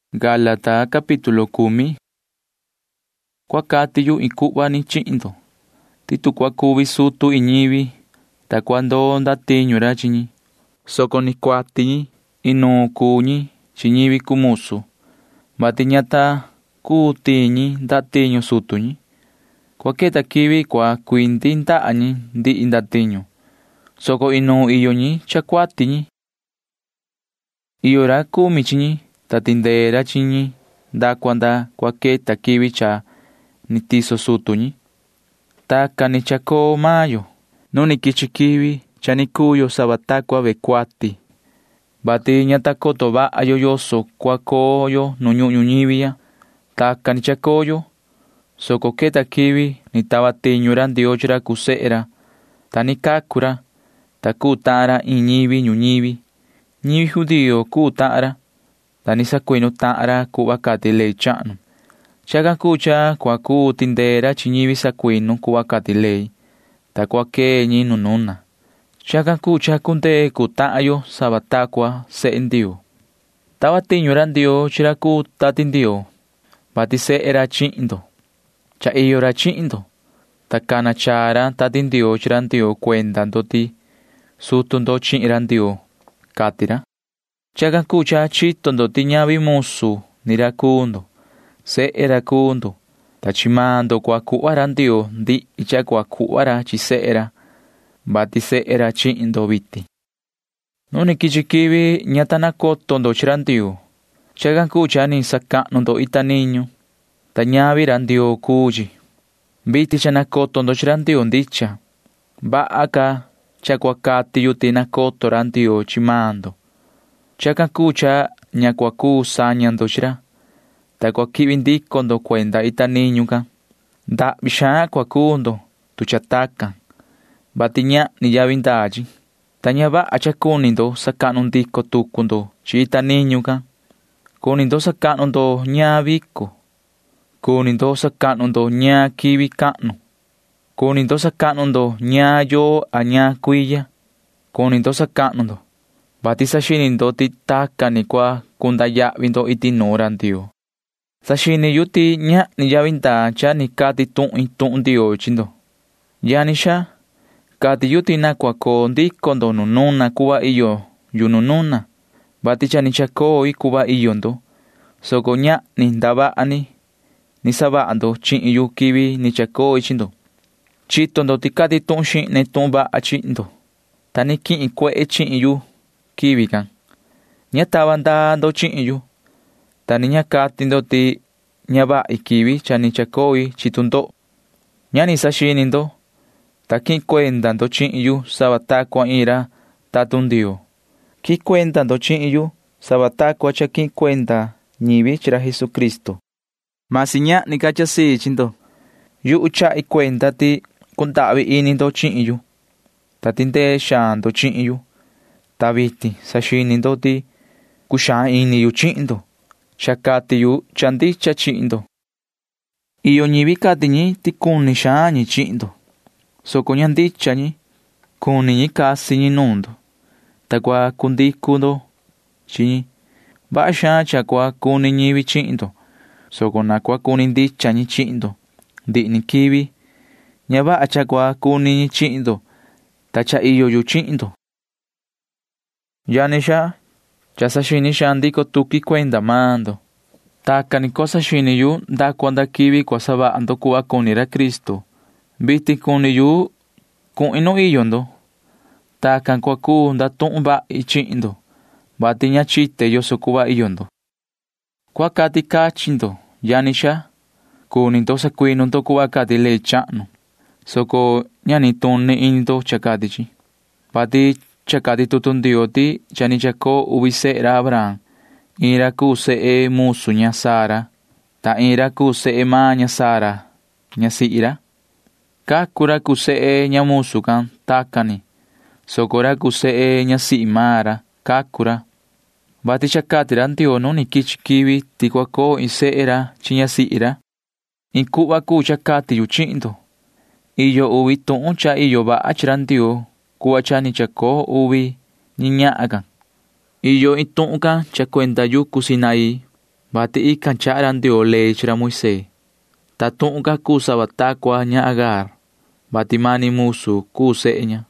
Yuhu cua cati iin cuhva chihin ndo ti tu cua cuvi iin ra sutu ñivi, ta cua ndoo ndatiñu ra chi ñi, soco ni cuati ñi, inuun iyo ñi chi ñivi cuu musu, vati ña ta cuu tiin ñi ndatiñu sutu ñi. Cua queta quivi cua cuindaha ñi chi ndihi ndatiñu, soco inuun iyo ñi cha cuati ñi. Iyo ra cumi chi ñi, ta tindee ra chi ñi nda cua nda cua queta quivi cha ni tiso sutu ñi. Tacan ni cha ni chacoo maan yo. Nu ni quichi quivi cha ni cuu yo sava ta cua ñi cuati, vati ña ta coto vaha yo yoso cuhva cua coo yo nu ñuhun ñuñivi ya. Tacan ni chacoo yo, soco cha queta quivi, ta tava tiñu ra Ndioo chi ra cuu sehe ra. Cha ni cacu ra, ta cuu tahan ra iin ñivi ñuñivi. Ñivi judío cuu tahan ra, ta ni sacuinu tahan ra cuhva cati ley chahnu can. Chacan cuu cha cua cuu tindee ra chi ñivi sacuinu cuhva cati ley, ta cua quee ñi nu nuna. Chacan cuu cha cundee cuu tahan yo sava ta cua sehe Ndioo. Tava tiñu ra Ndioo chi ra cuu Tati Ndioo, vati sehe ra chihin ndo. Cha iyo ra chihin ndo, ta cana chaa ra Tati Ndioo chi ra Ndioo cuenda ndo ti sutu ndo chihin ra Ndioo, cati ra. Chacan cuu cha chito ndo ti ñavi musu ni ra cuu ndo. Sehe ra cuu ndo, ta chi maan ndo cua cuhva ra Ndioo ndihi cha cua cuhva ra chi sehe ra, vati sehe ra chihin ndo vitin. Nu ni quichi quivi ña ta nacoto ndo chi ra Ndioo. Chacan cuu cha ni sacahnu ndo chi ita niñu ndo, ta ñavi ra Ndioo cuu chi. Vitin cha nacoto ndo chi ra Ndioo ndicha. Vaha ca cha cua cati yu ti nacoto ra Ndioo chi maan ndo. Chacan cuu cha ña cua cuu saña ndo chi ra, ta cua quihvi ndico ndo cuenda ita niñu can. Ndahvi xaan cua cuu ndo, tu cha tacan, vati ñahni yavi ndaa chi, ta ña vaha cha cuni sacahnu ndico tucu ndo chi ita niñu ndo. Cuni ndo sacahnu ndo ñaan vico. Cuni ndo sacahnu ndo ñaan quivi cahnu. Cuni ndo sacahnu ndo ñaan yoo a ñaan cuiya. Cuni ndo sacahnu ndo, [vati saxini ndo ti tacan ni cua cunda yahvi ndo iti nuun ra Ndioo]. Saxini yu ti coto ñahni yavi ndaa cha ni cati tuhin tuhun Ndioo chi ndo. Yani xaa, yu cati ti na cua coo ndico ndo nu nuna cuhva iyo yu nu nuna, vati cha ni chacoi cuhva iyo ndo vitin. Ñahni ndavaha ni cha ni savaha ndo chihin yu quivi ni chacoi chi ndo. Chito ndo ti cati tuhun xihne tuhun vaha chihin ndo, vati cha quihin cuehe chihin yu quivi can. Ña tava ndaa ndo chihin yu, ta ni ña cati ndo ti ña vahi quivi cha ni chacoo tu ndoho chihin yu. Ña ni saxini ndo, soco quihin cuenda ndo chihin yu sava ni ta cua quihin cuenda ñivi chi iin ra tatun Ndioo. Quihin cuenda ndo chihin yu sava ta cua quihin cuenda ñivi chi ra Jesucristo. Vasi ñahni ca cha tu sii ini chi ndo. Yuhu chahi cuenda ti cundahvi ini ndo chihin yu, ta cuni ndo tindee xaan ndo chihin yu. Ta vitin saxini ndo ti cuxaan ini yu chihin ndo, vati cha cati yu cha ndicha chihin ndo. Iyo ñivi cati ti cuni xaan ñi chihin ndo, soco ña ndicha ñi. Cuni ñi casi ñi nuun ndo, ta cua cundicu xaan ndo chi ñi. Vaha xaan cha cua cuni ñivi chihin ndo, soco na cua cuni ndicha ñi chihin ndo ndihi ni quivi. Ña vaha cha cua cuni ñi chihin ndo quivi cha iyo ni yu chihin ndo. Yani xaa, cha saxini xaan ndico tuqui cuenda maan ndo. Tacan ni cua saxini yu nda cua nda quivi cua savaha ndo cuhva cuni ra Cristo. Vitin cha cuni yu cuhin nu iyo ndo. Tacan ni cua cuu ndatuhun vahi chihin ndo, vati ña chite yoso cuhva iyo ndo. Cua cati cachin ndo, yani xaa. Cuni ndo sacuinu ndo cuhva cati ley chahnu, soco ña nituni ini ndo cha cati chi, vati cha cati tutu Ndioo ti cha ni chacoo uvi sehe ra Abraham. Iin ra cuu sehe ña musu ña Sara, ta iin ra cuu sehe ña Sara ñasihi ndicha ra. Cacu maan ra cuu sehe ña musu can tacan ni, soco ra cuu sehe ñasihi maan ra―cacu ra, vati cha cati ra Ndioo nu ni quichi quivi ti cua coo iin sehe ra chi ñasihi ra. Iin cuhva cuu cha cati yu chihin ndo. Iyo uvi tuhun cha iyo vaha chi ra Ndioo cuhva cha ni chacoo uvi ñahan can. Iyo iin tuhun can cuenda yucu Sinaí, [vati tican chaha ra Ndioo ley can chi ra Moisee,] ta inga tuhun can cuu sava ta cua ña Agar, vati mani musu cuu sehe ña.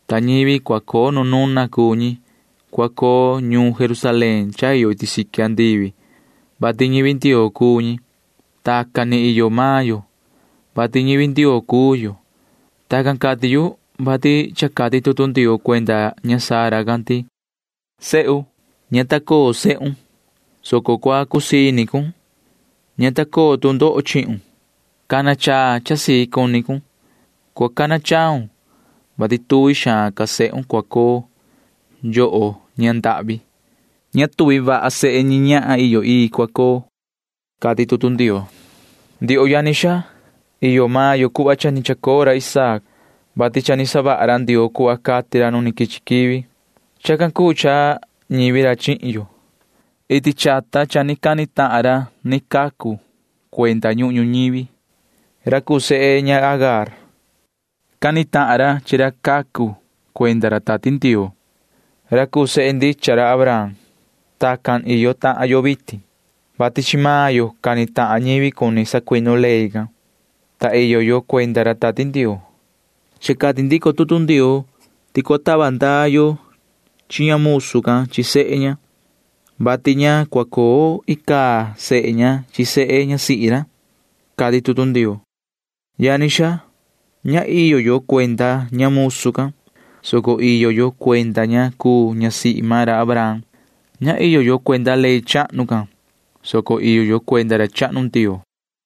Nu nuna iyo ñivi cha iyo cuenda ñuun Jerusalén iyo iti siqui andivi, vati ñivi Ndioo cuu ñi. Tacan ni iyo maan yo, vati ñivi Ndioo cuu yo. Tacan cati yu, vati cha cati tutu Ndioo cuenda ña Sara can ti: Yoho sihi, ña ta coo sehun, soco cua cusii ini cun. Ña ta coo tu ndoho chihun, soco cua ndahyu chaa cun. Cua cana chaun, vati cuaha xaan ca sehun cua coo, yoho ña ndahvi. Ña cuaha vaha sehe ña cha ni chacoo nuun chi ra rai can cua coo, cati tutu Ndioo. Ndioho yani xaa, iyo maan yo cuhva cha ni chacoo ra Isaac, vati cha ni savaha ra Ndioo cuhva cati ra nu ni quichi quivi. Chacan cuu cha ñivi ra chihin yo. Iti chata cha ni cani tahan ra ni cacu cuenda ñuhun ñuñivi, ra cuu sehe ña Agar. Cani tahan ra chi ra cacu cuenda ra Tati Ndioo, ra cuu sehe ndicha ra Abraham. Tacan ni tahan yo vitin, [vati chi maan yo cani tahan ñivi cuni sacuinu ley can, ta iyo yo cuenda ra Tati Ndioo]. Cha cati ndico tutu Ndioo ti cua tava ndaa yo chi ña musu can chi sehe ña, vati ña cua coo sehe ña chi sehe ñasihi maan ra icaa ni, cati tutu Ndioo. Yani xaa, ña iyo yo cuenda ña musu can, soco iyo yo cuenda ña cuu ñasihi maan ra Abraham. [Ña iyo yo cuenda ley chahnu can, soco iyo yo cuenda ra chahnu Ndioo.]